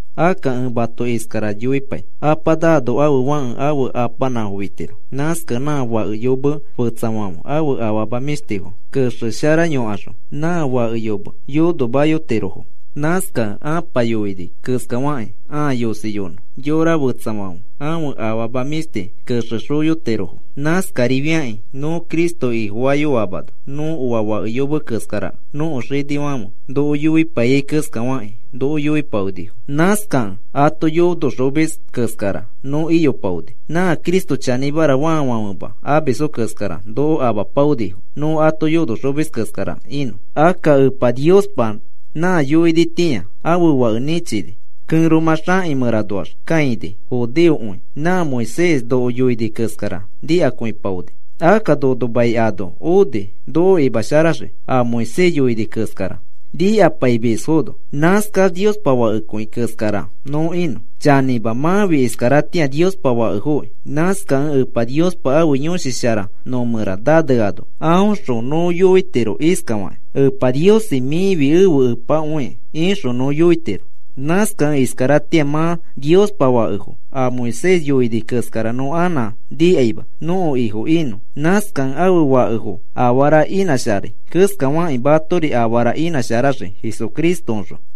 Akka ẽ mato iskara yoipai. Apa naano ãfe fãke ãfe apanãfo fitiro. Nãskakẽ nã fake yomekẽ, fetsafãfe ãfe afama mĩshtifo kexesharaxoyokaxõ, nã fake yome yonomayotirofo. Nãskakẽ ãpa yoini keskafakĩ ãa yosiyonõ, yora fetsafãfe ãfe afama mĩshti kexexoyotirofo. Nãskarifiakĩ nõ Cristo Ifofayoamano nõ oa fake yome keskarakẽ nõko xinifãfe noko yoipaiyai keskafakĩ noko yoipaonifo. Nãskakẽ ato yonoxomis keskara nõ iyopaoni. Nã Cristo chanĩmara faafãfema amisfo keskara noko amapaonifo nõ ato yonoxomis keskara inõ. Akka Epa Niospa nã yoinitĩa, ãfe Fake nĩchini, kẽromã xakĩ mẽranoax kãini judeokõi nã Moisés noko yoini keskara nikakõipaoni. Akka nono mai ano oni, noko imasharaxii a Moisés yoini keskara nikapaimisfono, nãskax Niospa fakekõi keskara nõ inõ. Chanĩma, mãfi iskaratĩa Niospa fakefoki. Nãskakẽ Epa Niospa ãfe Yõshi Shara nõ mẽra naneano aõxõ nõ yoitiro iskafakĩ: “Epa Niosi, mĩfi ẽfe Epakõi,” ixõ nõ yoitiro. Nãskakẽ iskaratĩa mã Niospa fakefo, a Moisés yoini keskara nõ anã nikaima nõko ifo inõ. Nãskakẽ afe fakefo afara inãsharai keskafakĩ matori afara inãsharaxii Jesucristoõxõ.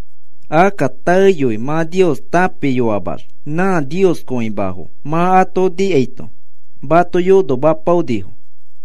Akka taeyoi mã Nios tãpiyoamax nã nioskõimafo mã ato nikaito mato yonomayopaonifo.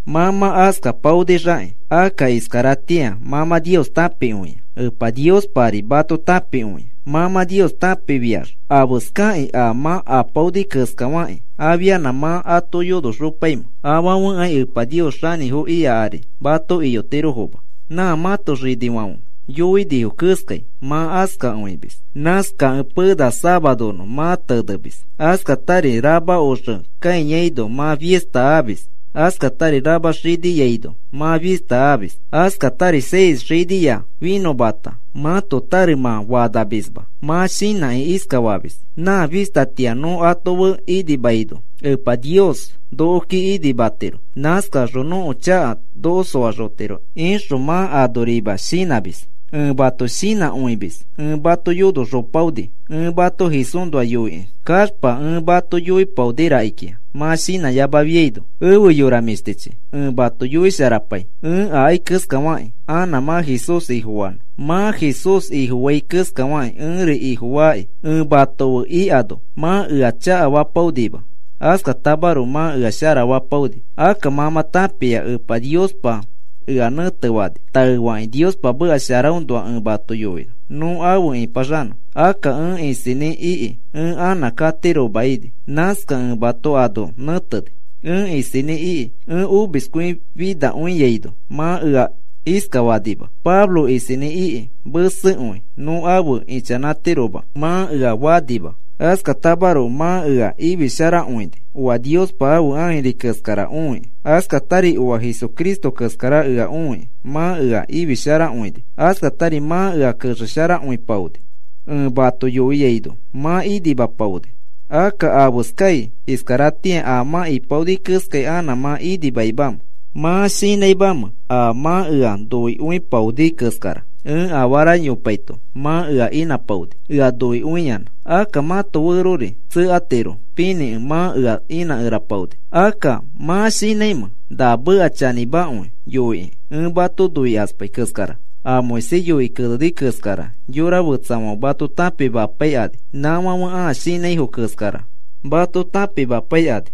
Mã mã askapaonixakĩ, akka iskaratĩa mã mã Nios tãpikõia. Epa Niospari mato tãpikõia. Mã mã Nios tãpikõifiax, ¿afeskakĩ a mã apaoni keskafakĩ afianã mã ato yonoxopaimẽ? Afãfekai Epa Nios xanĩfo ika ari mato iyotirofoma. Nã mãto xinifãfe yoinifo keskai mã askakõimis. Nãskakẽ pena safaronõ mã tenemis, askatari rama oxe kãiyaino mã fista amis, askatari rama xiniaino mã fista amis, askatari seis xinia finõmata mãto tare mã fanamisma. Mã shinãkĩ iskafamis: “Nã fistatĩa nõ ato fe inimaino Epa Nios nokoki inimatiro, nãskaxõ nõko chaka noko soaxotiro,” ixõ mã anorima shinãmis. Ẽ mato shinãkõimis ẽ mato yonoxopaoni. Ẽ mato Jesúsnoa yoikĩ kaxpa ẽ mato yoipaoni rakikĩa mã shinãyamafiaino. Efe yora mĩshtichi, ẽ mato yoisharapai ẽ akai keskafakĩ anã mã Jesús Ifofanõ. Mã Jesús Ifofai keskafakĩ ẽri Ifofaaki. Ẽ mato fe ikano mã ea chakafapaonima, askatamaroko mã ea sharafapaoni. Akka mã mã tãpia Epa Niospa ea nẽtefani taefakĩ Niospa meka sharaõnoa ẽ mato yoinõ nõ afe ipaxanõ. Akka ẽ isinĩ iki ẽ anã katiroma ini. Nãskakẽ ẽ mato ano nẽteni. Ẽ isinĩ iki ẽ omiskõifiaino mã ea iskafanima: “Pablo isinĩ iki mesekõi nõ afe ichanãtiroma,” mã ea fanima. Askatamaroko mã ea ifisharakõini oa Niospa ãfe ãjiri keskara õikĩ, askatari oa Jesucristo keskara ea õikĩ mã ea ifisharakõini, askatari mã ea kexesharakõipaoni. Ẽ mato yoiaino mã inimapaoni. Akka, ¿afeskai iskaratĩa a mã ipaoni keskai anã mã inimaimamẽ? ¿Mã shinãimamẽ a mã ea noikõipaoni keskara? Ẽ afara yopaito mã ea inãpaoni ea noikõiyanã. Akka mãto ferori tsekatiro pinĩkẽ mã ea inãkerapaoni. Akka, ¿mã shinãimẽ na meka chanĩmakõi yoikĩ ẽ mato noikaspai keskara? A Moisés yoikĩ keneni keskara yora fetsafãfe mato tãpimapaikani. Nãfãfe a shinãifo keskara mato tãpimapaikani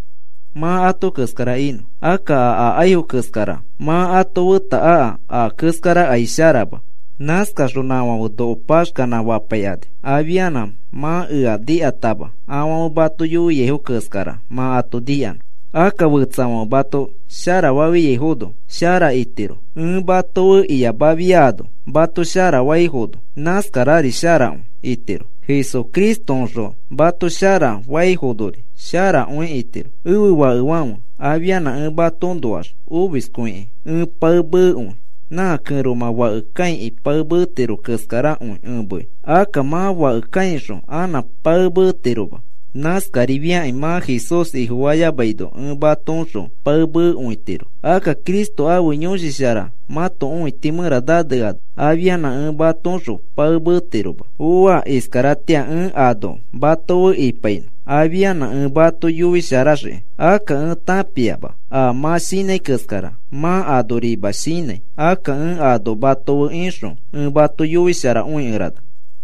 mã ato keskara inõ. Akka a akaifo keskara mã ato feta aka a keskarakai sharama. Nãskaxõ nãfãfe noko paxkanã fapaikani afianã mã ea nikatama afãfe mato yoiaifo keskara mã ato nikanõ. Akka fetsafãfe mato sharafaifono shara itiro. Ẽ mato fe iyamafiano mato sharafaifono, nãskarari sharakõi itiro. Jesucristoõxõ mato sharafaifonori sharakõi itiro. Ẽfe fakefãfe, afianã ẽ matoõnoax omiskõikĩ ẽ pae meekõi. Nã kẽromã fake kãikĩ pae meetiro keskarakõi ẽ mei. Akka mã fake kãixõ anã pae meetiroma. Nãskarifiakĩ mã Jesús Ifofayamaino ẽ matoõxõ pae meekõitiro. Akka Cristo ãfe Yõshi Shara mãto õiti mẽra naneano afianã ẽ mãtoõxõ pae meetiroma. Ooa. Iskaratĩa ẽ ano mato fe ipainõ afianã ẽ mato yoisharaxiki. Akka ẽ tãpiama a mã shinãi keskara mã anorima shinãi. Akka ẽ ano mato fe ixõ ẽ mato yoisharakõikerana.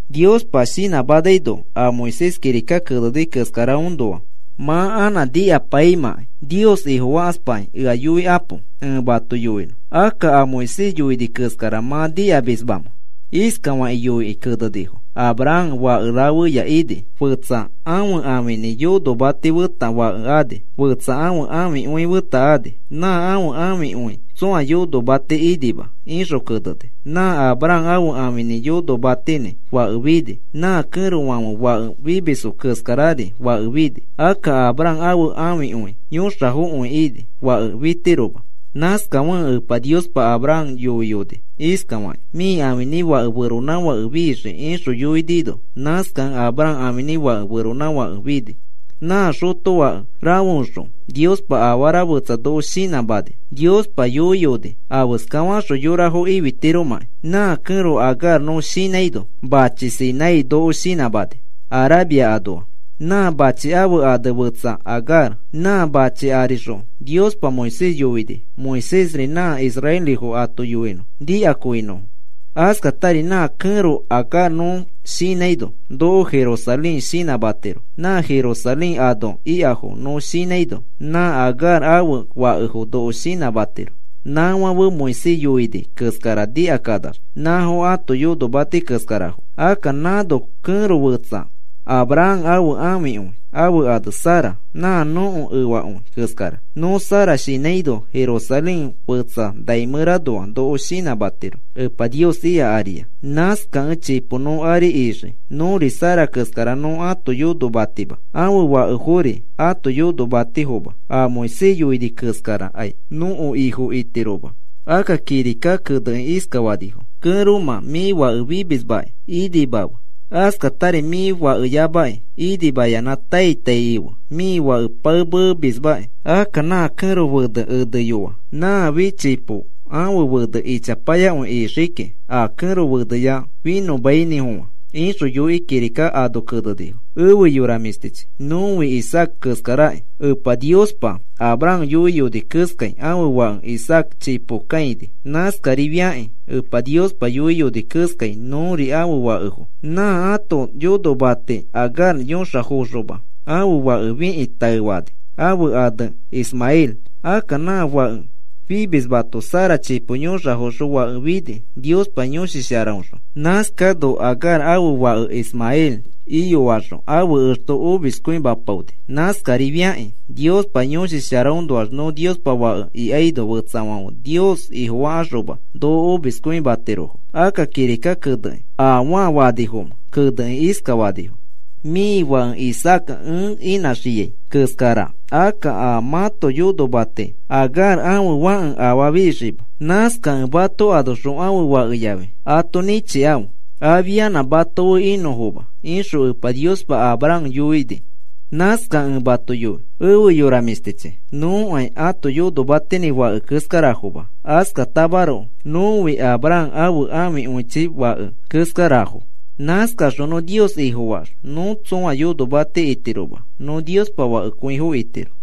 Niospa shinãmanaino a Moisés kirika keneni keskaraõnoa mã anã nikapaimãkai Nios Ifofakaspakĩ ea yoikapo ẽ mato yoinõ. Akka, ¿a Moisés yoini keskara mã nikamismamẽ? Iskafakĩ yoikĩ kenenifo: “Abraham fake rafeya ini. Fetsa ãfe ãfinĩ yonomati feta fake ani, fetsa ãfe ãfikõi feta ani. Nã ãfe ãfikõi tsõa yonomati inima,” ixõ keneni. Nã Abraham ãfe ãfinĩ yonomatinĩ fake fini, nã kẽrofãfe fake fimisfo keskarari fake fini. Akka Abraham ãfe ãfikõi yõxafokõi ini fake fitiroma. Nãskafekẽ Epa Niospa Abraham yoiyoni iskafakĩ: “Mĩ ãfinĩ fake feronãfake fixii,” ixõ yoinino, nãskakẽ Abraham ãfinĩ fake feronãfake fini. Nã xotofake rafeoxõ Niospa afara fetsa noko shinãmani. Niospa yoiyoni afeska faxõ yorafo ifitiromãkĩ. Nã kẽro Agar nõ shinãino machi Sinai noko shinãmani, Arabia anoa. Nã machi ãfe ane fetsa Agar. Nã machi arixõ Niospa Moisés yoini Moisésri nã israelifo ato yoinõ nikakõinõfo. Askatari nã kẽro Agar nõ shinãino noko Jerusalén shinãmatiro. Nã Jerusalén ano ikafo nõ shinãino nã Agar ãfe fakefo noko shinãmatiro. Nãfãfe Moisés yoini keskara nikakanax nãfo ãto yonomati keskarafo. Akka nãno kẽro fetsa Abraham ãfe ãfikõi. Ãfe ane Sara, nã nõko efakõi keskara. Nõ Sara shinãino Jerusalén fetsa nai mẽranoa noko shinãmatiro Epa Nios ika aria. Nãskakẽ chipo nõ ari ixii. Nõri Sara keskara nõ ãto yonomatima, ãfe fakefori ãto yonomatifoma. A Moisés yoini keskarakai nõko ifo itiroma. Akka kirika kenekĩ iskafanifo: Kẽromã, mĩ fake fimismakĩ inimafe, askatari mĩ fakeyamakĩ inimayanã tai tai ife mĩ fake pae meemismaki. Akka nã kẽro fenẽ eneyoa nãfi chipo ãfe fena ichapayakõi ixii kiki, a kẽro feneya finõmainĩfofã, ixõ yoikĩ kirika ano kenenifo. Efe yora mĩshtichi, nõfi Isaaca keskaraki. Epa Niospa Abraham yoiyoni keskai ãfe fake Isaaca chipo kãini. Nãskarifiakĩ Epa Niospa yoiyoni keskai nõri ãfe fakefo. Nã ãto yonomati Agar yõxafoxoma ãfe fake fikĩ taefani ãfe ane Ismael. Akka nã fake fimismato Sara chipo yõxafoxõ fake fini Niospa Yõshi Sharaõxõ. Nãskano Agar ãfe fake Ismael iyoaxõ ãfe exto omiskõimapaoni. Nãskarifiakĩ Niospa Yõshi Sharaõnoax nõ Niospa fake ikaino, fetsafãfe Nios Ifofakaxoma noko omiskõimatirofo. Akka kirika kenekĩ, ¿afaa fanifomẽ? Kenekĩ iskafanifo: “Mĩ fake Isaaca ẽ inãxiai keskara, akka nã mãto yonomati Agar ãfe fãke afaa fixiima. Nãskakẽ mato anoxõ ãfe fakeyafi ato nĩchikãfe afianã mato fe inõfoma,” ixõ Epa Niospa Abraham yoini. Nãskakẽ ẽ mato yoi efe yora mĩshtichi, nõkai a ãto yonomatinĩ fake keskarafoma. Askatamaroko nõfi Abraham ãfe ãfikõichi fake keskarafo. Nãskaxõ nõ Nios Ifofaax nõ tsõa yonomati itiroma, nõ Niospa fakekõifo itiro.